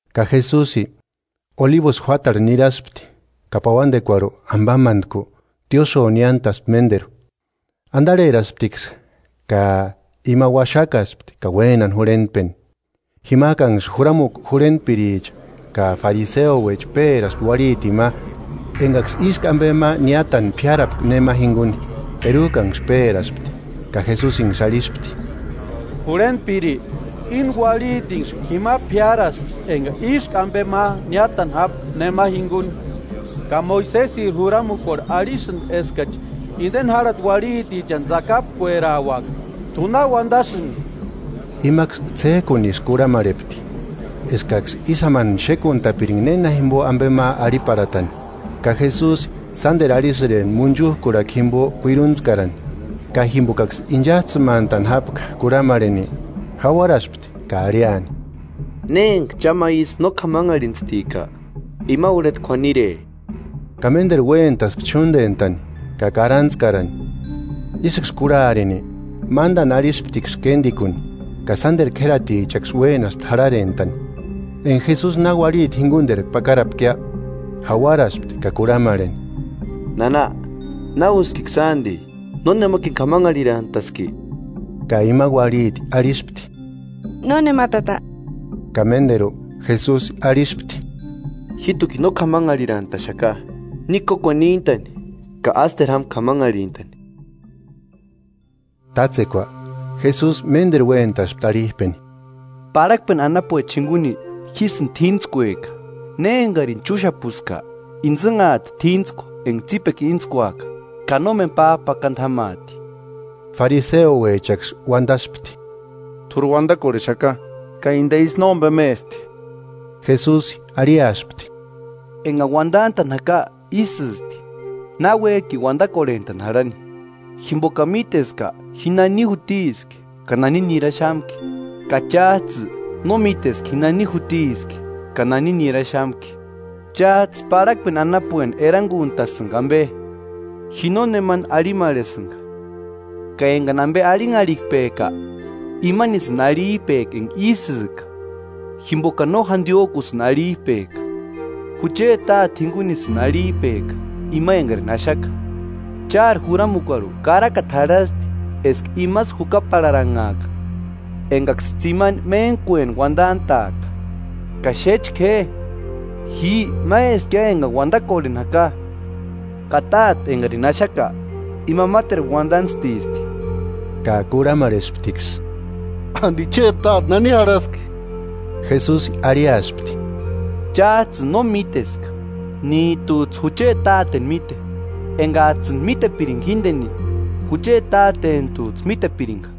Ka Jesusi Olibusï juátarhu niraspti, ka pauandekuarhu, ambamantku, tiósïo niántaspti ménderu. Andarherasptiksï, ka ima uaxakaspti ka uénani jurhentpeni. Jimajkanksï juramukua jurhentpiricha ka fariseouecha péraspti uarhitini ma engaksï ísku ambe ma niátani p'iárapka nema jinguni. Terujkanksï péraspti, ka Jesusinksï arhispti: –Jurhentpiri, íni uarhitinksï jima p'iárasti enga ísku ambe ma niátani jápka nema jinguni. Ka Moisesiri juramukuarhu arhisïndi eskachi indeni járhati uarhitichani tsakapkuerauaka. ¿T'u na uandasïnki? Imaksï ts'éjkunisï kurhamarhepti, eskaksï ísï jámani xékuntapiringa néna jimbo ambe ma arhiparhatani. Ka Jesusi sánderu arhisïrempti munchujkurhakua jimbo kuiruntskarani. Ka jimbokaksï inchajtsïmantani jápka kurhamarheni, jauaraspti ka arhiani: –Ne enga cha ma isï no k'amanharhintstika, ima urheta k'uanire. Ka ménderu uéntaspti ch'úndentani ka karantskarani. Isïksï kurharini, mándani arhisptiksï kéndikuni, ka sánderu k'ératichaksï uénaspti jarharentani. Enga Jesusi na uarhiti jinguniterku pakarapkia, Jauaraspti ka kurhamarheni: –Nana, ¿Na úskiksïa andi? ¿Nónemakini k'amanharhirantaski? Ka ima uarhiti arhispti: –Nónema Tata. Ka ménderu Jesusi arhispti: –Jíjtukini no k'amanharhirantaxaka; ni kókuani níntani ka ásteru jáma k'amanharhintani. Tátsekua Jesusi ménderu uéntaspti arhijpeni: –Parhakpeni anapuecha jinguni jísïni t'íntskueka, ne engarini chúxapuska, intsïnhati t'íntskua enga tsípekua íntskuaka, ka nómeni p'ájpakandu jámaati. Fariseouechaksï uandaspti: –T'úri uandakorhexaka: Ka inde isï nómbemesti. Jesusi arhiaspti: –Engani uandantani jaka isïsti, náuejkini uandakorhentani jarhani, jimbokani míteska ji nani jutiski, ka nani niraxamki; ka chájtsï no míteska ji nani jutiski, ka nani niraxamki. Chájtsï parhakpeni anapueni eranguntasïnga ambe. Ji nónemani arhimarhesïnga; ka engani ambe arhinharhipejka, imanisïni arhijpejka enga isïjka, jimbokani no jandiojkusïni arhijpejka, jucheti Táte jingunisïni arhijpejka, ima engarini axaka. Chári juramukuarhu karakata jarhasti eska imasï jukaparharanhaaka engaksï tsimani méntkueni uandantaaka. Ka xéchka je, ji máeskia engani uandakorhentani jaka, ka Táte engarini axaka ima máteru uandantstisti. Ka kurhamarhesptiksï: –¿Andi chéti táte nani jarhaski? Jesusi arhiaspti: –Chájtsïni no míteska, níjtujtsï jucheti Táteni míte; engajtsïni mítepiringa jíndeni, jucheti Tátenijtujtsï mítepiringa.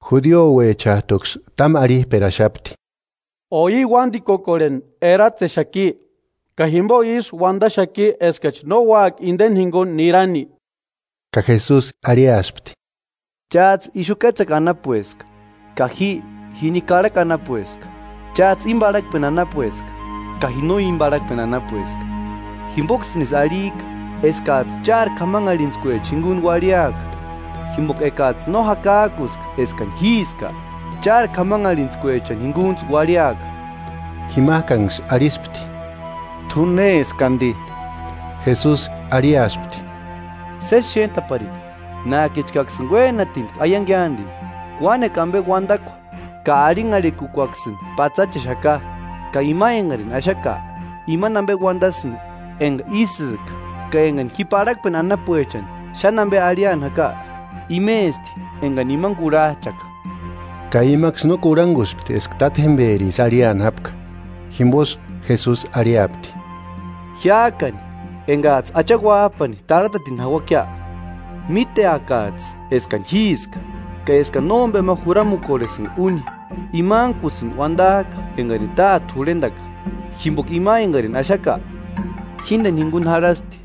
Judiouechajtuksï támu arhijperaxapti: –¿O i uándikukorheni eratsexaki? ¿Ka jimbo ísï uandaxaki eskachi no úaka inde jinguni nirani? Ka Jesusi arhiaspti: –Chájtsï ixu kétsekua anapueska, ka ji jini karhakua anapueska; chájtsï íni parhakpeni anapueska, ka ji no íni parhakpeni anapueska. Jimboksïnisï arhijka eskajtsï chári k'amanharhitskuechani jinguni uarhiaka; jimboka ekajtsï no jakajkuska eskani Jíska, chári k'amanharhitskuechani jingunijtsï uarhiaka. Jimajkanksï arhispti: –¿T'u néski andi? Jesusi arhiaspti: –Sési xéntaparini, nájkichkaksïni uénanitki aiangia andi. Uánekua ambe uandakua ka arhinharhikukuaksïni patsachexaka, ka ima engarini axaka imani ambe uandasïndi enga ísïka, ka engani ji parhakpeni anapuechani xáni ambe arhiani jaka, imesti engani imani kurhajchaka. Ka imaksï no kurhanguspti eska Tátjemberisï arhiani jápka. Jimbosï Jesusi arhiapti: –Jiájkani engajtsï Acha Uájpani tarhatatini jauakia, míteakajtsï eskani Jíska, ka eskani nómbema juramukorhesïnga úni; imankusïni uandajka engarini Táte jurhendaka. Jimboka ima engarini axaka, jíndeni jinguni jarhasti;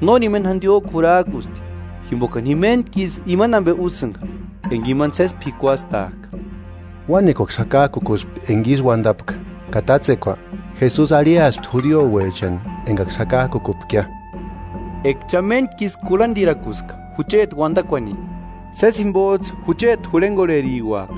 nórini méni jandiojku jurarkusti, jimbokani ji méntku isï imani ambe úsïnga enga imani sési p'ikuastajka. Uánekuaksï jakajkukuspti enga ísï uandapka. Ka tátsekua Jesusi arhiaspti judiouechani engaksï jakajkukupkia: –Eka cha méntkisï kurhandirakuska jucheti uandakuani, sési jimbojtsï jucheti jurhengorheriuaka;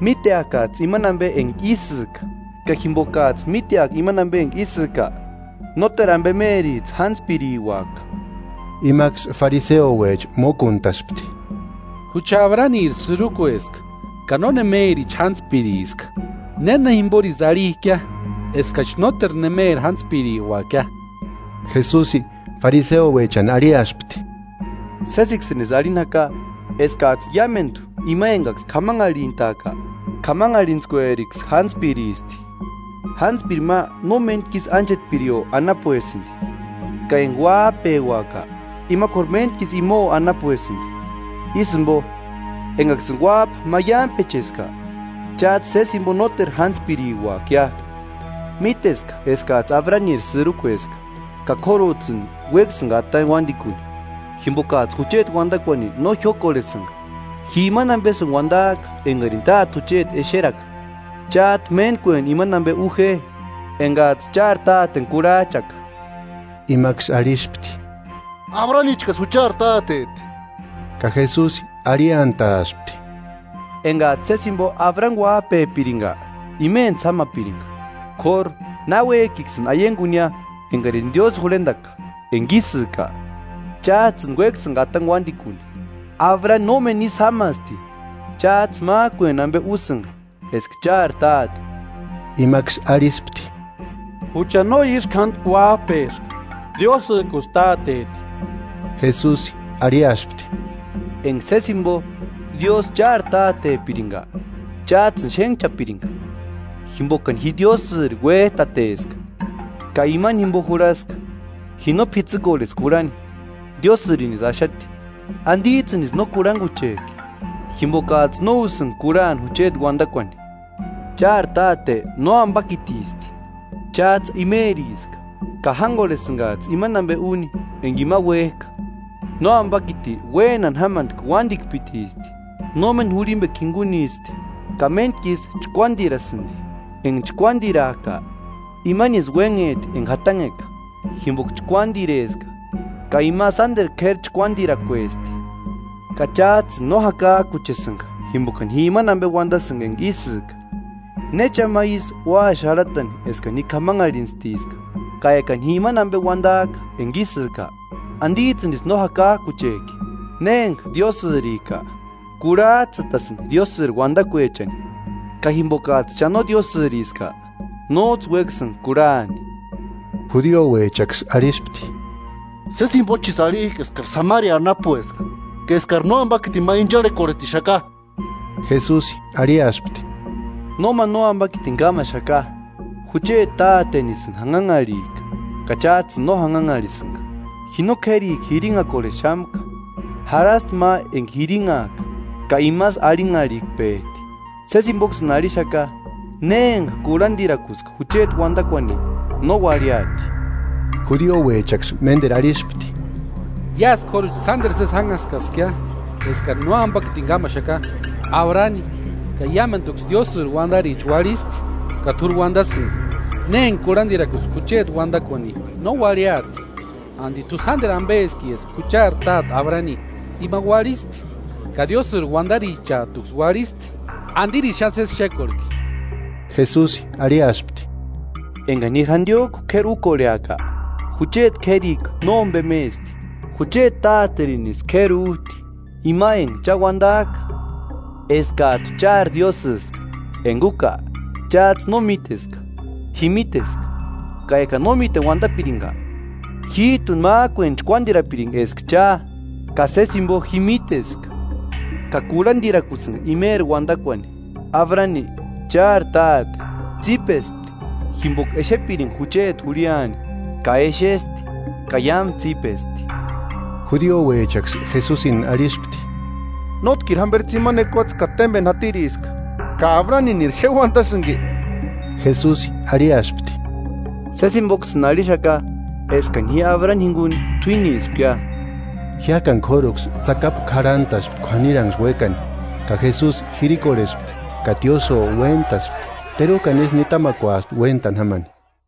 míteakajtsï imani ambe enga ísïka, ka jimbokajtsï míteaka imani ambe enga ísïka, nóteru ambemerijtsï jántspiriuaka. Imaksï [fariseuecha] mókuntaspti: –Jucha Abraniri sïrukueska, ka nónemerichi jántspiriska; ¿Néna jimborisï arhijkia eskachi nóteru némeri jántspiriuakia? Jesusi [fariseuechani] arhiaspti: –Sésiksïnisï arhini jaka eskajtsï iámendu ima engaksï k'amanharhintajka, k'amanharhintskueriksï jántspiristi. Jántspiri ma no méntku isï ánchetpirio anapuesïndi; ka enga uájpeuaka, ima k'óru méntkisï imao anapuesïndi. Ísï jimbo, engaksïni Uájpa maiampecheska, chájtsï sési jimbo nóteru jántspiriuakia. Míteska eskajtsï Abraniri sïrukueska; ka k'órujtsïni uéksïnga atani uándikuni jimbokajtsï jucheti uandakuani no jiókorhesïnga. Ji imani ambesïni uandajka engarini Táte jucheti exeraka; chájtu méntkueni imani ambe u je engajtsï chári táteni kurhajchaka. Imaksï arhispti: –¡Abranichkasï juchari táteti! Ka Jesusi arhiantaspti: –Engajtsï sési jimbo Abrani uájpepiringa, imentsï jámapiringa. K'óru, náuejkiksïni aiangunia engarini Diósï jurhendaka enga ísïka, chájtsïni uéksïnga atani uándikuni. ¡Abrani nómeni ísï jámasti! Chájtsï májkueni ambe úsïnga eska chári táte. Imaksï arhispti: –¡Jucha no ísku jándi uájpeska; Diósïjkusï Táteti! Jesusi arhiaspti: –Enga sési jimbo Diósï chári tátepiringa, chájtsïni xénhchapiringa, jimbokani ji Diósïri uéjtateska ka imeri jimbo jurhaska, ji no p'itsïkorheska jurhani, Diósïrinisï axati. ¿Andijtsïnisï no kurhanguchejki? Jimbokajtsï no úsïnga kurhani jucheti uandakuani. Chári táte nóambakitisti; chájtsï imeriska, ka jángorhesïngajtsï imani ambe úni enga ima uéjka. Nóambakiti uénani jámantki uandikpitisti. No méni jurhimbekua jingunisti, ka méntkisï chkuándirasïndi. Enga chkuándirajka, imanisï uénhejti enga jatanheka; jimboka chkuándireska ka ima sánderu k'éri chkuadirakuesti. Ka chájtsïni no jakajkuchesïnga jimbokani ji imani ambe uandasïnga enga ísïka. ¿Ne cha ma ísï ua xarhatani eskani ji k'amanharhintstiska? Ka ekani ji imani ambe uandajka enga ísïka, ¿Andijtsïnisï no jakajkuchejki? Ne emanga Diósïrika, kurhajtsïtasïndi Diósïri uandakuechani; ka jimbokajtsï cha no Diósïriska, nójtsï uéksïnga kurhani. Judiouechaksï arhispti: Sési jimbochisï arhijka eskari Samaria anapueska ka eskari nóambakitini ma incharhekorhetixaka. Jesusi arhiaspti: –Nóma nóambakitini kámaxaka. Jucheti tátenisïni janhanharhijka ka chájtsïni no janhanharhisïnga. Ji no k'érikua jirinhakorhexamka; jarhasti ma enga jirinhajka, ka imasï arhinharhikpejti. Sési jimboksïni arhixaka, ne enga kurhandirakuska jucheti uandakuani, no uarhiati. Judiouechaksï ménderu arhispti: –Iásï k'óruchi sánderu sési jánhaskaskia eskari nóambakitini kámaxaka. Abrani, ka iámenduksï Diósïri uandaricha uarhisti, ka t'úri uandasïnga: “Ne enga kurhandirakuska jucheti uandakuani, no uarhiati” ¿Andi t'u sánderu ambeski eska juchari táte Abrani? Ima uarhisti, ka Diósïri uandarichajtuksï uarhisti. ¿Andirisï xáni sési xékorhki? Jesusi arhiaspti: –Engani ji jandiojku k'éri ukorheaka, jucheti k'érikua nómbemesti. Jucheti Táterinisï k'óru k'éri újti, ima enga cha uandajka eskajtu chári Diósïska Enga úka, chájtsï no míteska. Ji míteska; ka ekani no míteni uandapiringa, jíjtuni májkueni chkuándirapiringa eska cha. Ka sési jimbo ji míteska, ka kurhandirakusïnga imeri uandakuani. Abrani, chári táte, tsípespti jimboka exepiringa jucheti jurhiani; ka exesti, ka iámu tsípesti. Judiouechaksï Jesusini arhispti: –Nótkiri jamberi tsimani ekuatse ka témbeni jatiriska ¿Ka Abraniniri xéni uandasïnki? Jesusi arhiaspti: –Sési jimboksïni arhixaka eskani ji Abrani jinguni t'uínispkia. Jiájkani k'óruksï tsakapu k'arhantaspti k'uaniranksï uékani; ka Jesusi jirikorhespti ka tiósïo uéntaspti; terujkani isï nitamakuaspti uéntani jámani.